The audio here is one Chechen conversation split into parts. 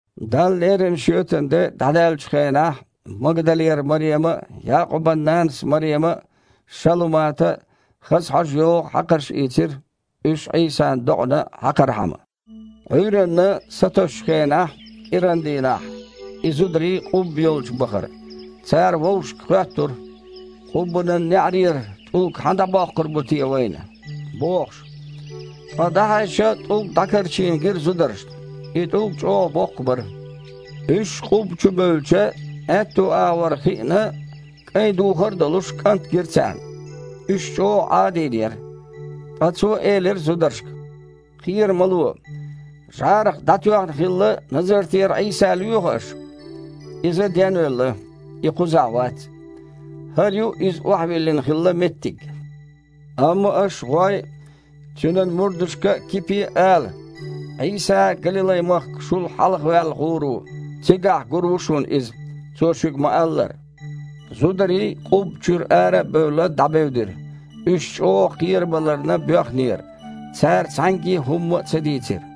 Далла лерина шоьтан де дІадаьллачу хенахь Магдалера Марема а, Якъубан нанас Марема а, Шалумата а хаза хьожа йогІу хьакхарш ийцира, уьш Іийсан докъана хьакхархьама. Іуьйранна, сатосучу хенахь, кІирандийнахь и зударий къубба йолчу бахара. Цара вовшашка хоьттура: «Къуббанан неІарера тІулг хьан дІабоккхур бу те вайна?» – бохуш. Ткъа дІахьаьжча, тІулг дІакарчийна гира зударшна. И тІулг чІогІа боккха бара. Уьш къубба чу бевлча, аьтту агІор хиъна, кІайн духар а долуш, кІант гира царна. Уьш чІогІа Іадийнера. Ткъа цо элира зударшка: «Кхера ма ло. ЖІарах дІатоьхна хилла Назартера Іийса лоьху аш? Иза денвелла. И кхузахь вац. ХІара ю Иза охьавиллина хилла меттиг. Амма аш, гІой, Цуьнан мурдашка а, Кипе а ала: „Іийса Галилай-махка шул хьалхаваьлла гІур ву, цигахь гур ву шуна Иза, Цо шуьга ма-аллара“». Зударий, къубба чуьра ара а бевлла, дІабевдира. Уьш чІогІа кхерабаларна боьхнера, цара цхьаьнгге а хІумма а ца дийцира.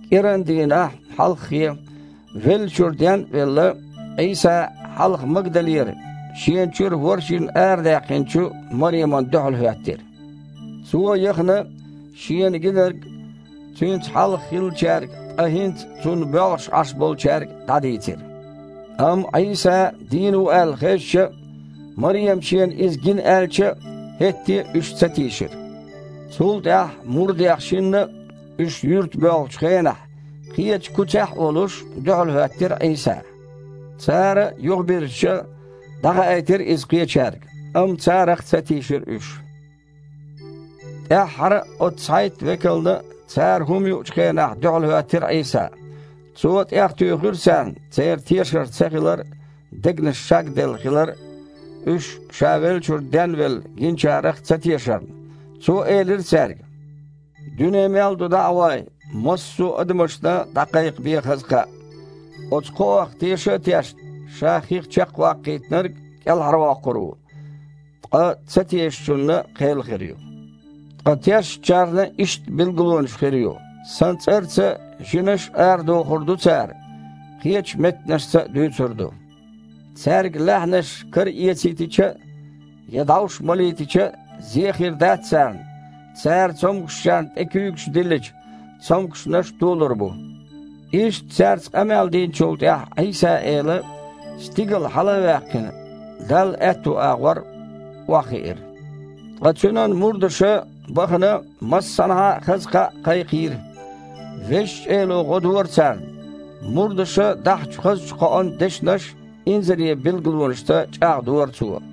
КІирандийнахь, хьалххе, веллачуьра ден а велла, Іийса хьалха Магдалера, шена чуьра ворхІ жин арадаьккхинчу Маремана дуьхьал хІоьттира. Цо яхана шена гинарг Цуьнца хьалха хиллачаьрга, ткъа хІинца Цунна боьлхуш Іаш болчаьрга дІадийцира. Амма Іийса дийна ву аьлла хезча а, Марема шена Иза гина аьлча а, хІетте а уьш ца тийшира. Цул тІаьхьа мурдех шинна а, уьш юьрта боьлхучу хенахь, кхечу куьцехь а волуш, дуьхьалхІоьттира Іийса. Цара а, юхабирзича, дІахаийтира иза кхечаьрга, амма царах а ца тийшира уьш. ТІаьххьара а оцу цхьайтта векална а, цара хІума юучу хенахь, дуьхьалхІоьттира Іийса. Цо тІехтуьйхира царна церан тешар ца хилар а, дегнаш шагделла хилар а, уьш Ша веллачуьра денвелла гинчарех а ца тешарна. Цо элира цаьрга: «Дуьне мел ду дІа а гІой, массо а адамашна дІакхайкхабе хаза кхаъ. Оцу кхоах теша а тешна, ша хих чекхваккхийтинарг кІелхьарвоккхур ву, ткъа ца тешачунна – кхел хир ю. Ткъа тешначарна иштта билгалонаш хир ю: Сан цІарца жинаш а арадохур ду цара, кхечу меттанашца а дуьйцур ду. Цаьрга лаьхьанаш караэцийтича а, я дІовш малийтича а зе хир дац царна, цара цомгушчарна тІе куьйгаш диллича, цомгушнаш толур бу». Иштта цаьрца къамел динчул тІаьхьа Іийса-Эла, стигала хьала а ваьккхина, Далла аьтту агІор охьахиира. Ткъа Цуьнан мурдаша, бахана, массанхьа а хаза кхаъ кхайкхийра. Везачу Эло гІо дора царна. Мурдаша дахьачу хазачу кхоан дешнаш инзаре билгалонашца чІагІдора Цо.